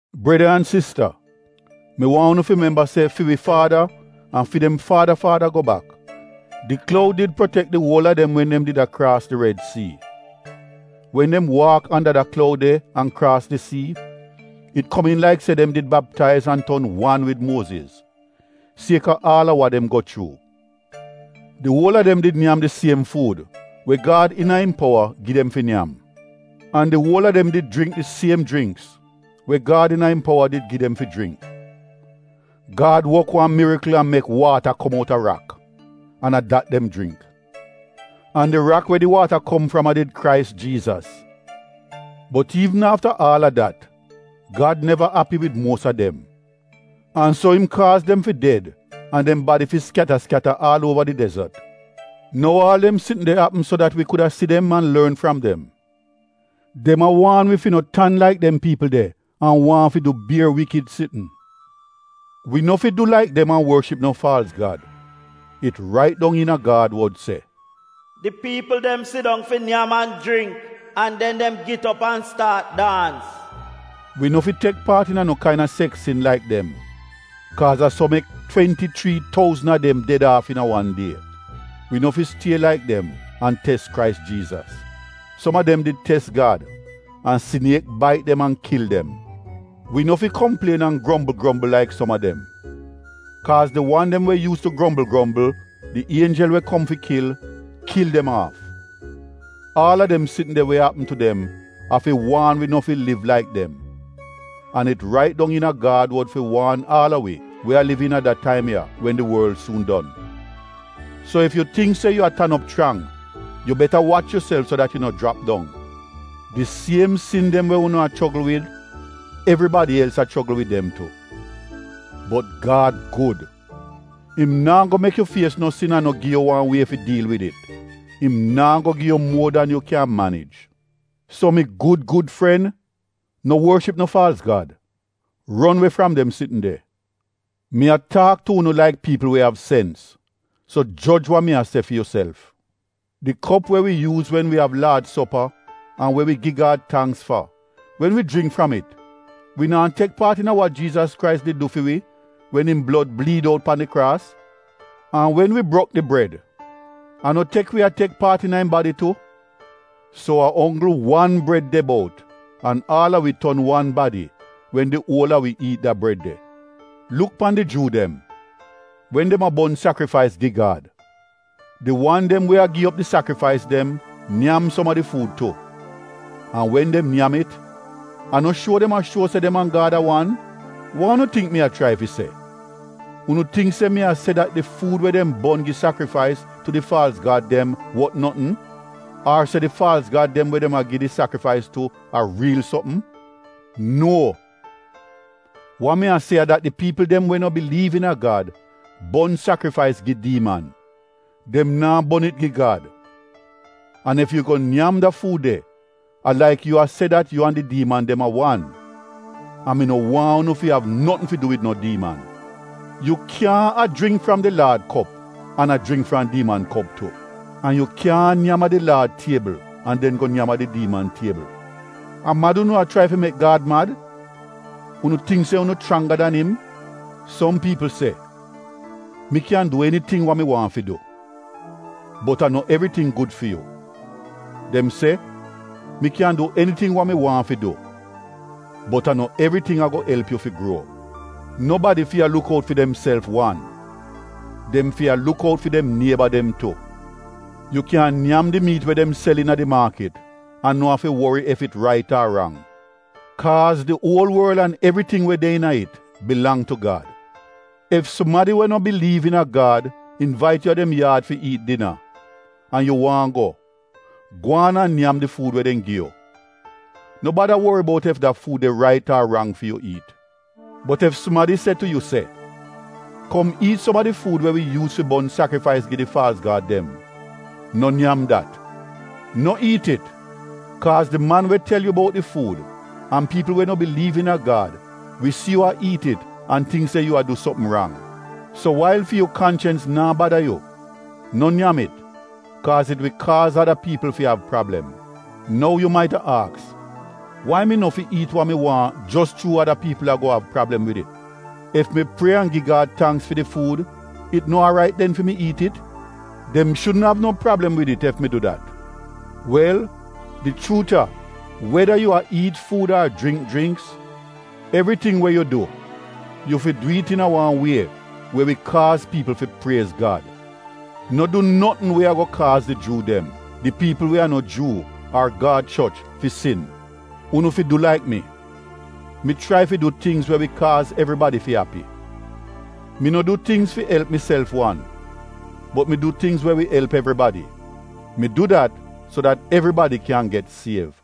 Breda an sista mi waahn unu fi memba se fi wi faada an fi dem faada faada go bak, di kloud did protek di uol a dem wen dem did a kraas di red sii. Wen dem waak anda da kloud de an kraas di sii, it komiin laik se dem did baptaiz an ton wan wid Muoziz, sieka aal a wa dem go chuu. Di uol a dem did nyam di siem fuud we Gad iina im powa gi dem fi nyam. An di uol a dem did jringk di siem jringks we Gad iina im powa did gi dem fi jringk. Gad wok wan mirikl an mek waata kom outa rak, an a dat dem jringk. An di rak we di waata kom fram a did Krais di wan we Gad Anaint. Bot iivn afta aal a dat, Gad neva api wid muos a dem. An so im kaaz dem fi ded an dem badi fi skyata skyata aal uova di dezot. Nou aal dem sitn de apm so dat wi kuda si dem an lorn fram dem. Dem a waan wi fi no tan laik dem piipl de an waahn fi du bier iivl sitn. Wi no fi du laik dem an worship no faalz gad. It rait dong iina Gad wod se, “Di piipl dem sidong fi nyam an jringk an den dem git op an staat daans.” Wi no fi tek paat iina no kaina seks sin laik dem. Kaaz a so mek twenti chrii touzn a dem ded aaf iina wan die. Wi no fi stie laik dem an tes Krais Jiizas. Som a dem did tes Gad an siniek bait dem an kil dem. Wi no fi komplien an grombl grombl laik som a dem. Kaaz di wan dem we yuus tu grombl grombl, di ienjel we kom fi kil, kil dem aaf. Aal a dem sitn de we apm tu dem a fi waan wi no fi liv laik dem. An it rait dong iina Gad wod fi waan aal a wi we a liv iina da taim ya wen di worl suun don. So ef yu tingk se yu a tan op chrang, yu beta wach yuself so dat yu no jrap dong. Di siem sin dem we unu a chogl wid, evribadi els a chogl wid dem tu. Bot Gad gud, im naa go mek yu fies no sin an no gi yu wan wie fi diil wid it — im naa go gi yu muor dan yu kyan manij. So mi gud gud fren, no worship no faalz Gad — ron we fram dem sitn de. Mi a taak tu unu laik piipl we av sens, so joj wa mi a se fi yuself. Di kop we wi yuuz wen wi av Laad sopa an we wi gi Gad tangks fa: wen wi jringk fram it wi naa tek paat iina wa Jiizas Krais did du fi wi wen im blod bliid out pan di kraas? An wen wi brok di bred a no tek wi a tek paat iina im badi tu? So a onggl wan bred de bout an aal a wi ton wan badi wen di uol a wi iit da bred de. Luk pan di Juu dem: wen dem a bon sakrifais gi Gad, di wan dem we a gi op di sakrifais dem nyam som a di fuud tu. An wen dem nyam it, a no shuo dem a shuo se dem an Gad a wan? Wa unu tingk mi a chrai fi se? Unu tingk se mi a se dat di fuud we dem bon gi sakrifais tu di faalz gad dem wot notn? Ar se di faalz gad dem we dem a gi di sakrifais tu a riil sopm? Nuo! Wa mi a se a dat di piipl dem we no biliiv iina Gad bon sakrifais gi diiman, dem naa bon it gi Gad. An ef yu go nyam da fuud de, a laik yu a se dat yu an di diiman dem a wan, an mi no waahn unu fi av notn fi du wid no diiman. Yu kyaahn a jringk fram di Laad kop an a jringk fram diiman kop tu. An yu kyaahn a nyam a di Laad tiebl an den go nyam a di diiman tiebl. A mad unu a chrai fi mek Gad mad? Unu tingk se unu chrangga dan im? Som piipl se, “Mi kyan du eniting wa mi waahn fi du,” bot a no evriting gud fi yu. Dem se, “Mi kyan du eniting wa mi waahn fi du,” bot a no evriting ago elp yu fi gruo. Nobadi fi a luk out fi demself wan, dem fi a luk out fi dem nieba dem tu. Yu kyan nyam di miit we dem sel iina di maakit an no afi wori ef it rait ar rang kaaz “Di uol worl an evriting we de iina it bilang tu Gad.” Ef sumadi we no biliiv iina Gad invait yu a dem yaad fi iit dina, an yu waahn go, gwaan an nyam di fuud we dem gi yu. No bada wori bout ef da fuud de rait ar rang fi yu iit. Bot ef sumadi se tu yu se, “Kom iit som a di fuud we wi yuuz fi bon sakrifais gi di faalz Gad dem,” no nyam dat. No iit it kaaz di man we tel yu bout di fuud an piipl we no biliiv iina Gad wi si yu a iit it an tingk se yu a du sopm rang. So wail fi yu kanchens naa bada yu, no nyam it kaaz it wi kaaz ada piipl fi av prablem. Nou yu maita aks wai mi no fi iit wa mi waahn jos chuu ada piipl ago av prablem wid it? Ef mi prie an gi Gad tangks fi di fuud, it no aarait den fi mi iit it? Dem shudn av no prablem wid it ef mi du dat. Wel, di chuut a weda yu a iit fuud ar jringk jringks — evriting we yu du, yu fi du it iina wan wie we wi kaaz piipl fi priez Gad. No du notn we ago kaaz di Juu dem, di piipl we a no Juu ar Gad choch fi sin. Unu fi du laik mi. Mi chrai fi du tingz we wi kaaz evribadi fi api. Mi no du tingz fi elp miself wan bot mi du tingz we wi elp evribadi. Mi du dat so dat evribadi kyan get siev.